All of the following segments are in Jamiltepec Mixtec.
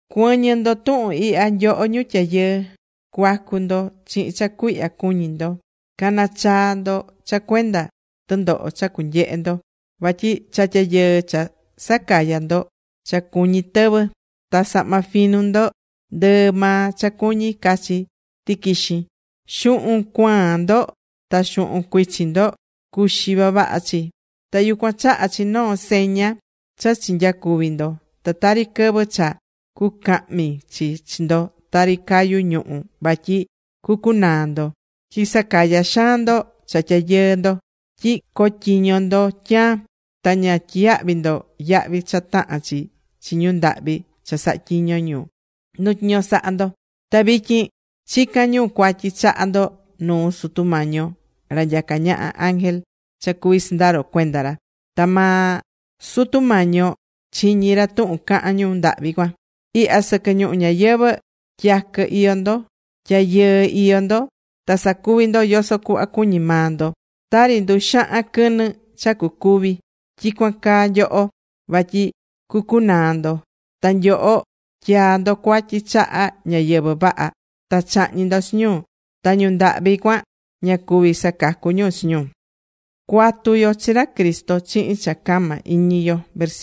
¡Cuɨ̱ñɨ ndo tuhun ihya, nyoho ñu tyayɨɨ! Cua̱cu ndo chihin cha cuihya cuñi ndo, ca̱nachaa ndo cha cuenda tɨndoho cha cunyehe ndo. Vatyi cha tyayɨɨ cha sacayá ndo, cha cuñí tɨvɨ. Ta sahma finu ndo, ndɨɨ maa cha cuñi cachi tɨquixin. Xuhun cuaan ndo ta xuhun cuichin ndo cuxi vavaha chi. Ta yucuan chahá chi noo seña cha chinyacuvi̱ ndo. Ta tari quɨvɨ cha cucahmi chi chi ndo tari cayu ñuhu̱ vatyi cucunaa ndo. Tyi sacayá xaan ndo cha tyayɨɨ ndo tyi cotyiño ndo tyaan. Ta ña tyiyahvi̱ ndo yahvi cha tahán chi chi ñu ndahvi cha sahatyiño̱ nu tyiño sahá ndo. Ta vityin chicán ñu cuatyi chaha ndo nuu Sutu Mañi yo ra nyacá ñaha ángel cha cuví sɨndaro cuenda ra. Ta maa Sutu Mañi yo chiñí ra tuhun cahán ñu ndahvi cuan. Ihya sɨquɨ ñuhu ñayɨvɨ̱ tyaquɨ iyó ndo, tyayɨɨ́ iyó ndo. Ta sacuví ndo yoso cuhva cuñí maa ndo. Tari nduxahan quɨnɨ cha cucúvi, tyicuan caa nyoho, vatyi cucunaa ndo. Ta nyoho tyaa̱ ndo cuatyi chaha ñáyɨvɨ vaha. Ta chahñi̱ ndo chi ñu. Ta ñu ndahvi cuan ña cuví sacacu ñu chi ñu.Cua̱tu yo chi ra Cristo chihin cha cama iñi yo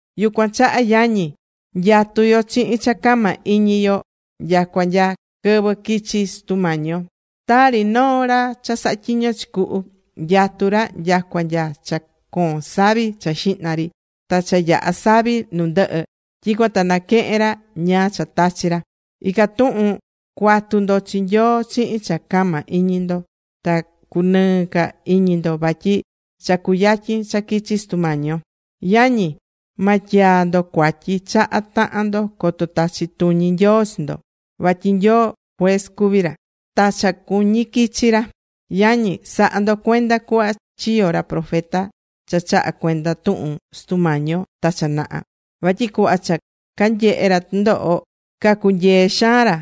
Yucuan chaha, yañi, nyatú yo chihin cha cama iñi yo nyacua nya quɨvɨ quichi Sutu Mañi yo. Tari noo ra cha sahá tyiño chi cuhu nyatú ra nyacua nya cha coon savi cha xihna ri ta cha yaha savi nu ndɨhɨ, tyicuan ta naquehen ra ñáá cha tachi̱ ra. Ican tuhun cua̱tu ndo chi Nyoo chihin cha cama iñi ndo. Ta cunɨɨ ca iñi ndo vatyi cha cuyatyin cha quichi Sutu Mañi yo. Yañi, ma tyaa ndo cuatyi chaha tahan ndo, coto tachi tuñi Nyoo chi ndo. Vatyi Nyoo, juez cuví ra. Ta cha cuñi quichi ra. Yañi, sa̱ha ndo cuenda cuhva chiyo̱ ra profeta cha chaha cuenda tuhun Sutu Mañi yo ta cha naha, vatyi cuhva cha canyehé ra tɨndoho, cacunyee xaan ra.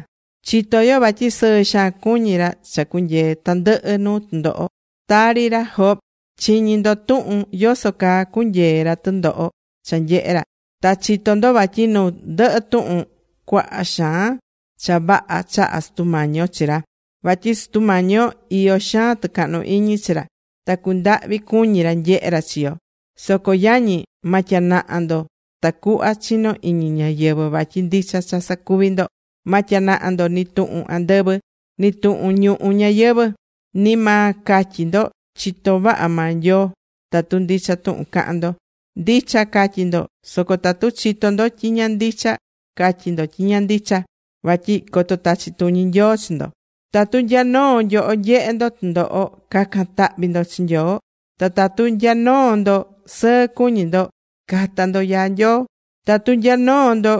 Chitó yo vatyi sɨɨ xaan cuñí ra cha cunyee̱ tandɨhɨ nuu tɨndoho. Tari ra Job. Chiñi̱ ndo tuhun yoso caa cunyee̱ ra tɨndoho cha nyehe̱ ra. Ta chitó ndo vatyi nu ndɨhɨ tuhun, cuaha xaan cha vaha chaha̱ Sutu Mañi yo chi ra. Vatyi Sutu Mañi yo iyó xaan tɨcahnu iñi chi ra. Ta cundahvi cuñi ra nyehe ra chi yo. Soco yañi, ma tyanaha ndo tacuhva chino iñi ñáyɨvɨ vatyi ndicha cha sacuví ndo. Ma tyanaha ndo nɨ tuhun andɨvɨ, ni tuhun ñuhu ñayɨvɨ̱, ni ma catyi ndo: “Chitó vaha maa Nyoo.” Tatu ndicha tuhun cahán ndo, ndicha ca̱tyi ndo. Soco tatu chitó ndo tyi ña ndicha, ca̱tyi ndo tyi ña ndicha, vatyi coto tachi tuñi Nyoo chi ndo. Tatu nya noo nyoho nyehé ndo tɨndoho, ca̱can tahvi ndo chi Nyoo. Ta tatu nya noo ndo sɨɨ cuñí ndo, ca̱ta ndo yaa Nyoo. Tatu nya noo ndo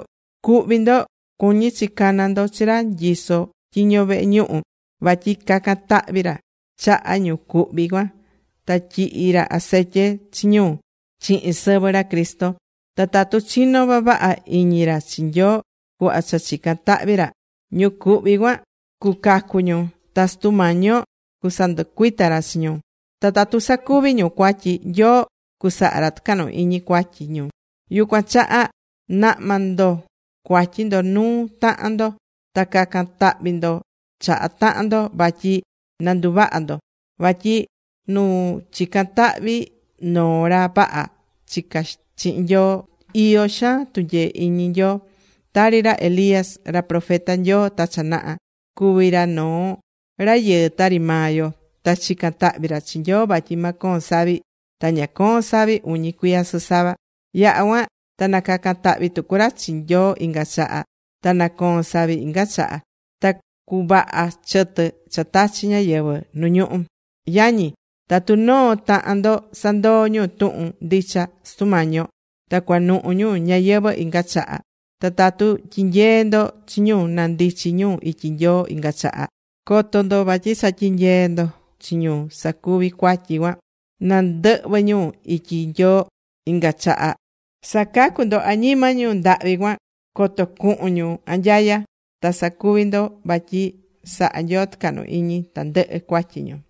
cuhví ndo, cuñí chi cana ndo chi ra nyisó tyiño vehe ñuhu vatyi cacan tahvi ra chaha ñu cuhví cuan ta tyihi ra acetye chi ñu chihin sɨvɨ ra Cristo. Ta tatu chinó vavaha iñi ra chi Nyoo cuhva cha chicán tahvi ra, ñu cuhvi cuan cucacu ñu. Ta Sutu Mañi yo cusanducuita ra chi ñu. Ta tatu sacuvi̱ ñu cuatyi, Nyoo cusaha ra tɨcahnu iñi cuatyi ñu. Yucuan chaha na̱hma ndo cuatyi ndo nuu tahan ndo. Ta ca̱can tahvi ndo chaha tahan ndo vatyi na nduvaha ndo. Vatyi nu chicán tahvi noo ra vaha chicá chihin Nyoo iyó xaan tunyee iñi Nyoo. Tari ra Elías ra profeta Nyoo ta cha naha. Cuvi̱ ra noo rayɨɨ tari maa yo. Ta chica̱n tahvi ra chi Nyoo vatyi ma coon savi. Ta ña coo̱n savi uñi cuiya sɨsava. Yaha̱ cuan ta nacaca̱n tahvi tucu ra chi Nyoo inga chaha. Ta nacoo̱n savi inga chaha. Ta cuvaha̱ chɨtɨ cha tachi̱ ñáyɨvɨ nu ñuhú. Yañi, tatu noo tahan ndo sandoo̱ ñu tuhun ndicha Sutu Mañi yo, ta cuanuhu ñu ñayɨvɨ̱ inga chaha, ta tatu tyinyeé ndo chi ñu na ndichi ñu ityi Nyoo inga chaha, co̱to ndo vatyi cha tyinyeé ndo chi ñu sacuvi̱ cuatyi cuan na ndɨhvɨ ñu ityi Nyoo inga chaha, sacacú ndo añima ñu ndahvi cuan coto cuhun ñu anyaya. Ta sacuvi̱ ndo vatyi saha̱ Nyoo tɨcahnu iñi tandɨhɨ cuatyi ñu.